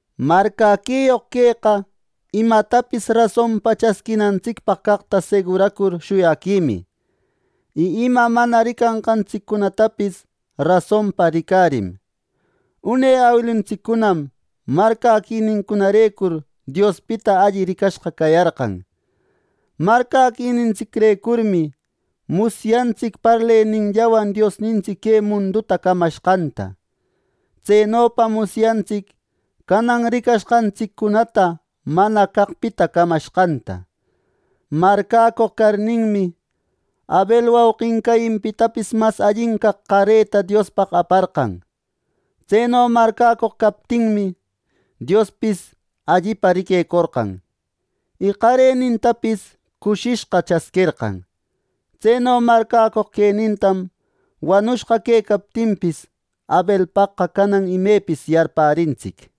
Marcäquiyoq queqa imatapis rasonpa chasquinantsicpaq caqta seguracur shuyaquimi, y ima mana ricanqantsiccunatapis rasonpa ricarim. Une awiluntsiccunam marcäquinincunarecur Diospita alli ricashqa cayarqan. Marcäquinintsicrecurmi musyantsic parleninllawan Diosnintsic que munduta camashqanta. Tsenopam musyantsic canan ricashqantsiccunata mana caqpita camashqanta. Marcäcoq carninmi, Abel wauqin Cainpitapis mas allin caq qareta Diospaq aparqan. Tseno marcäcoq captinmi, Diospis allipa riquecorqan, y qarenintapis cushishqa chasquerqan. Tseno marcäcoq quenintam wanushqa quecaptinpis, Abelpaqqa canan imepis yarpärintsic.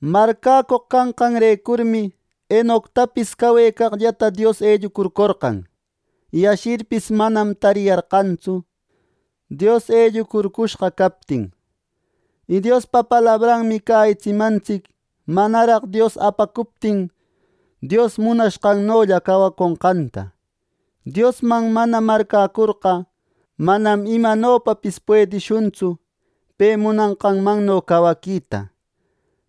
Marcäcoq canqanrecurmi Enoctapis cawecaqllata Dios ellucurcorqan, y ashirpis manam tariyarqantsu Dios ellucurcushqa captin. Y Diospa palabranmi cäyitsimantsic manaraq Dios apacuptin Dios munashqanno cawaconqanta. Diosman mana marcäcurqa, manam imanopapis puedishuntsu pe munanqanno cawaquita.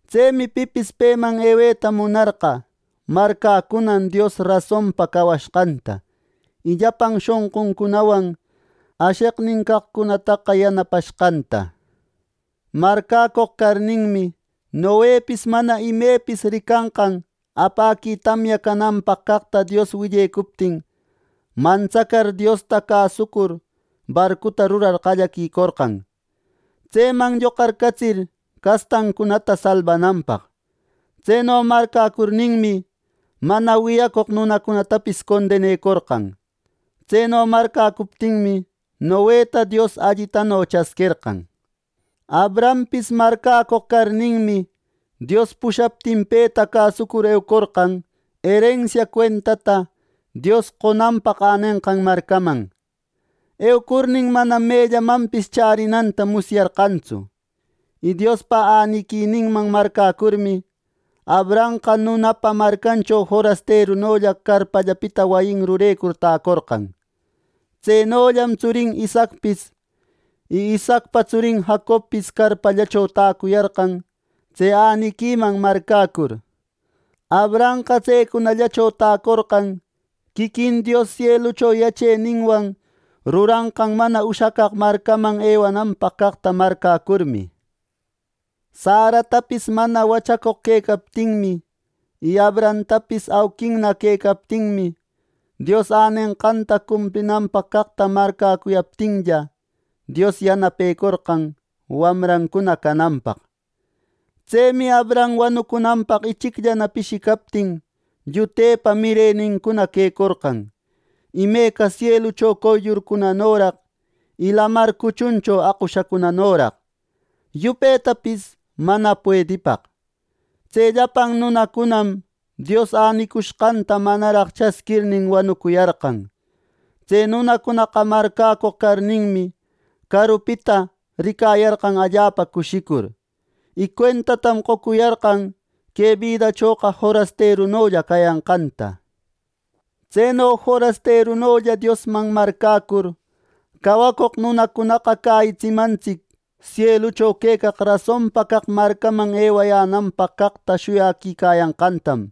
Tsemi pipis peman eweta munarqa, marcäcunan Dios rasonpa cawashqanta, y llapan shonquncunawan asheqnin caqcunataqa yanapashqanta. Marcäcoq carninmi, Noepis mana imepis ricanqan apäqui tamya cananpaq caqta Dios willecuptin, mantsacar, Diosta cäsucur, barcuta rurar qallaquicorqan, tseman lloqarcatsir castancunata salbananpaq. Tseno marcäcurninmi, mana wiyacoq nunacunatapis condenecorqan. Tseno marcäcuptinmi, Noeta Dios allitano chasquerqan. Abrahampis marcäcoq carninmi, Dios pushaptin peta cäsucur eucorqan erensia cuentata Dios qonanpaq änenqan marcaman. Eucurnin, manam mellamanpis chärinanta musyarqantsu. Y Diospa äniquininman marcäcurmi, Abrahamqa nunapa marcancho forasterunolla carpallapita wayin rurecur täcorqan. Tsenollam tsurin Isaacpis y Isaacpa tsurin Jacobpis carpallacho täcuyarqan tse äniquiman marcäcur. Abrahamqa tsecunallacho täcorqan quiquin Dios sielucho yacheninwan ruranqan mana ushacaq marcaman ewananpaq caqta marcäcurmi. Saratapis mana wachacoq quecaptinmi, y Abrahamtapis auquinna quecaptinmi, Dios änenqanta cumplinanpaq caqta marcäcuptinlla, Dios yanapecurqan wamrancuna cananpaq. Tsemi Abraham wanucunanpaq ichicllana pishicaptin llutepa mirenincuna quecorqan; imeca sielucho qoyllurcunanoraq, y lamar cuchuncho aqushanoraq, yupetapis mana puedipaq. Tse llapan nunacunam Dios änicushqanta manaraq chasquirnin wanucuyarqan. Tse nunacunaqa marcäcoq carninmi, carupita ricayarqan allapa cushicur, y cuentatam qocuyarqan que bidachoqa forasterunolla cayanqanta. Tseno forasterunolla Diosman marcäcur, cawacoq nunacunaqa cäyitsimantsic sielucho quecaq rasonpa caq marcaman ewayänanpaq caqta shuyaquicayanqantam.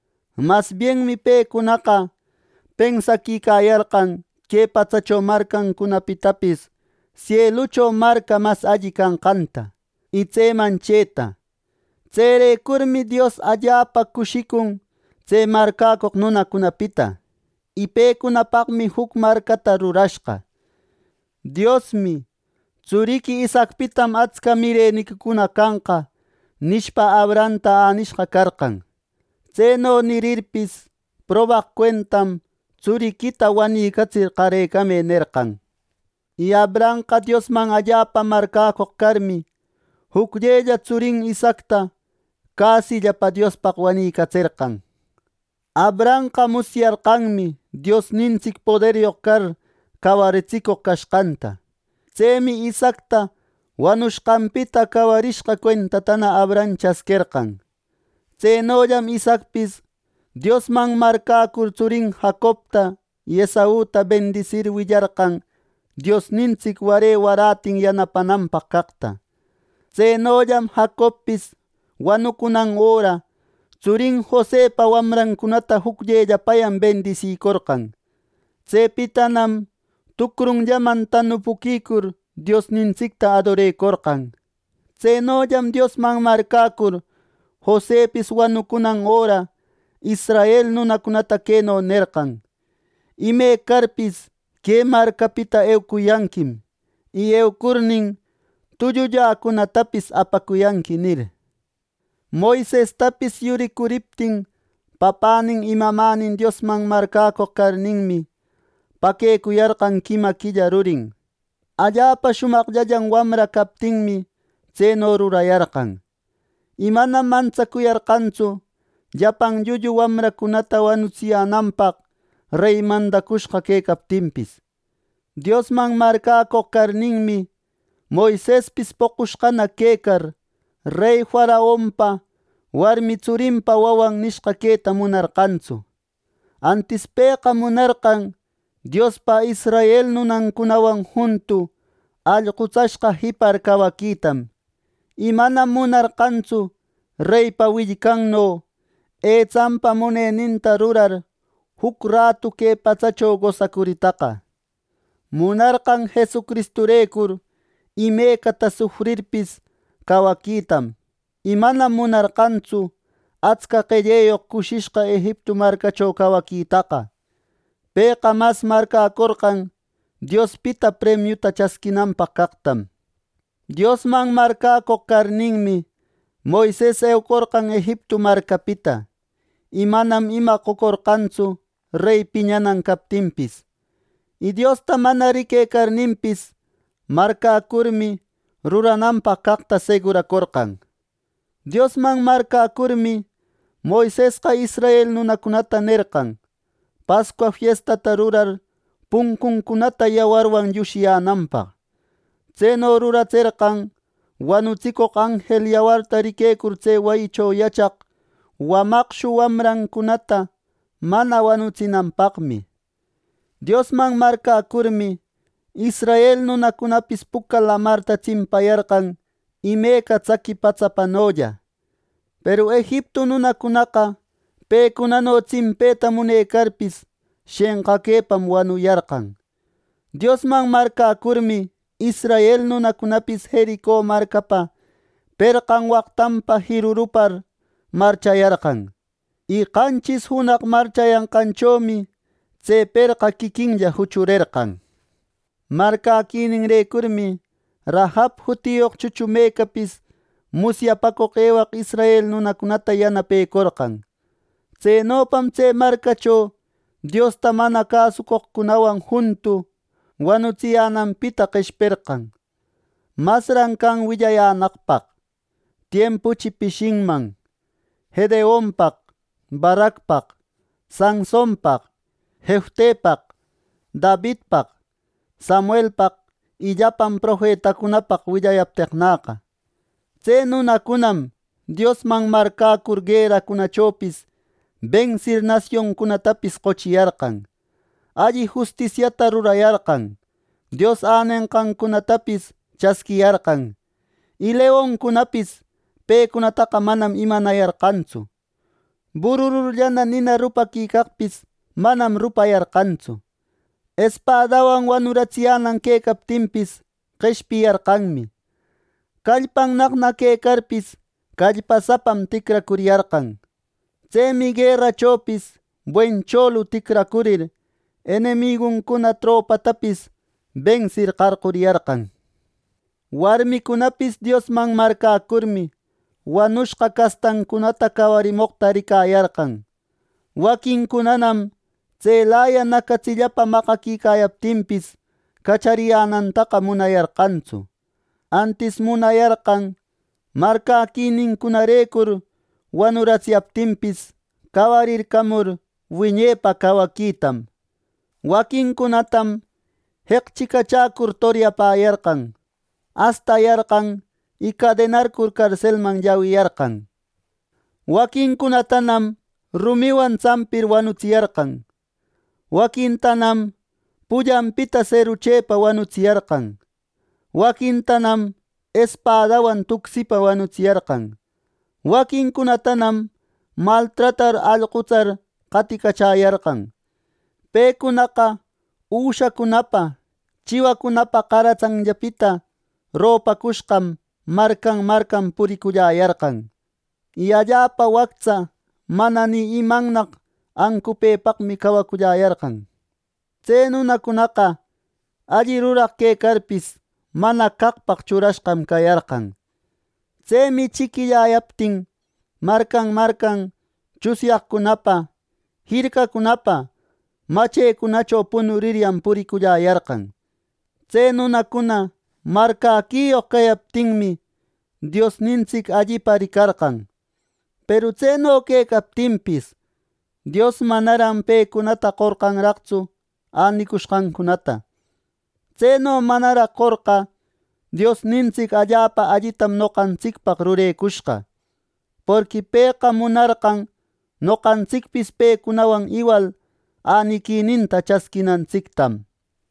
Mas bienmi pecunaqa pensaquicayarqan que patsacho marcancunapitapis sielucho marca mas alli canqanta, y tseman chëta. Tserecurmi Dios allapa cushicun tse marcäcoq nunacunapita, y pecunapaqmi juc marcata rurashqa. Diosmi “Tsuriqui Isaacpitam atsca mireniquicuna canqa” nishpa, Abrahamta änishqa carqan. Tseno nirirpis, probaq cuentam “Tsuriquita wanicatsir qarecamë” nerqan. Y Abrahamqa Diosman allapa marcäcoq carmi, jucllella tsurin Isaacta cäsillapa Diospaq wanïcatserqan. Abrahamqa musyarqanmi Diosnintsic poderyoq car cawaritsicoq cashqanta. Tsemi Isaacta wanushqanpita cawarishqa cuentatana Abraham chasquerqan. Tsenollam Isaacpis Diosman marcäcur tsurin Jacobta y Esauta bendisir willarqan Diosnintsic ware warätin yanapananpaq caqta. Tsenollam Jacobpis wanucunan öra, tsurin Josepa wamrancunata jucllellapayan bendisicorqan. Tsepitanam tucrunllaman tanupuquicur, Diosnintsicta adorecorqan. Tsenollam Diosman marcäcur Josepis wanucunan öra, israel nunacunata queno nerqan “Imecarpis que marcapita eucuyanquim; y eucurnin, tullulläcunatapis apacuyanqui” nir. Moisestapis yuricuriptin papänin y mamänin Diosman marcäcoq carninmi, paquecuyarqan quima quilla rurin. Allapa shumaqllan wamra captinmi, tseno rurayarqan. Y manam mantsacuyarqantsu llapan llullu wamracunata wanutsiyänanpaq rey mandacushqa quecaptinpis. Diosman marcäcoq carninmi, Moisespis poqushqana quecar, rey faraonpa warmi tsurinpa wawan nishqa queta munarqantsu. Antis pëqa munarqan Diospa israel nunancunawan juntu allqutsashqa jipar cawaquitam, y manam munarqantsu reypa willcanno, etsanpa muneninta rurar juc ratu que patsacho gosacuritaqa. Munarqan Jesucristurecur imecata sufrirpis, cawaquitam y manam munarqantsu atsca qelleyoq cushishqa Egiptu marcacho cawaquitaqa. Pëqa mas marcäcorqan Diospita premiuta chasquinanpaq caqtam. Diosman marcäcoq carninmi, Moises eucorqan Egiptu marcapita, y manam ima qocorqantsu rey piñanan captinpis. Y Diosta mana riquecarninpis, marcäcurmi rurananpaq caqta seguracorqan. Diosman marcäcurmi, Moisesqa israel nunacunata nerqan Pascua fiestata rurar puncuncunata yawarwan llushiyänanpaq. Tseno ruratserqan wanutsicoq anjel yawarta riquecur tse wayicho yachaq wamaqshu wamracunata mana wanutsinanpaqmi. Diosman marcäcurmi, israel nunacunapis Puca Lamarta tsimpayarqan imeca tsaqui patsapanolla; peru Egiptu nunacunaqa, pecunano tsimpeta munecarpis, shenqaquepam wanuyarqan. Diosman marcäcurmi, israel nunacunapis Jerico marcapa perqan waqtanpa jirurupar marchayarqan, y qanchis junaq marchayanqanchomi tse perqa quiquinlla juchurerqan. Marcäquininrecurmi Rahab jutiyoq chuchumecapis musyapacoq ewaq israel nunacunata yanapecorqan. Tsenopam tse marcacho Diosta mana cäsucoqcunawan juntu wanutsiyänanpita qeshperqan. Masran can willayänaqpaq. Tiempuchi pishinman Gedeonpaq, Baracpaq, Sansonpaq, Jeftepaq, Davidpaq, Samuelpaq y llapan profetacunapaq willayapteqnäqa. Tse nunacunam Diosman marcäcur gueracunachopis bensir nasioncunatapis qochiyarqan, alli justisiata rurayarqan, Dios änenqancunatapis chasquiyarqan, y leoncunapis pecunataqa manam imanayarqantsu. Burururllana nina rupaquicaqpis manam rupayarqantsu; espadawan wanuratsiyänan quecaptinpis, qeshpiyarqanmi, callpannaqna quecarpis, callpasapam ticracuriyarqan. Tsemi guerachopis buen cholu ticracurir, enemiguncuna tropatapis bensir qarquriyarqan. Warmicunapis Diosman marcäcurmi, wanushqa castancunata cawarimoqta ricayarqan. Waquincunanam tselaya nacatsillapa maqaquicayaptinpis, cachariyänantaqa munayarqantsu. Antis munayarqan marcäquinincunarecur wanuratsiyaptinpis, cawarircamur wiñepa cawaquitam. Waquincunatam jeqchicachacur toryapäyarqan, astayarqan y cadenarcur carselman llawiyarqan, Waquincunatanam rumiwan tsampir wanutsiyarqan. Waquintanam pullanpita serruchepa wanuratsiyarqan. Waquintanam espadawan tucsipa wanutsiyarqan. Waquincunatanam maltratar, allqutsar qaticachäyarqan. Pecunaqa üshacunapa, chiwacunapa qaratsanllapita ropacushqam marcan marcan puriculläyarqan, y allapa wactsa mana ni imannaq ancupëpaqmi cawaculläyarqan. Tse nunacunaqa alli ruraq quecarpis, mana caqpaq churashqam cayarqan. Tsemi chiquilläyaptin marcan marcan tsunyaqcunapa, jircacunapa machecunacho punuriryan puriculläyarqan. Tse nunacuna marcäquiyoq cayaptinmi, Diosnintsic allipa ricarqan. Peru tseno quecaptinpis, Dios manaran pecunata qorqanraqtsu änicushqancunata. Tseno manaraq qorqa Diosnintsic allapa allitam noqantsicpaq rurecushqa. Porqui pëqa munarqon noqantsicpis pecunawan iwal äniquininta chasquinantsictam.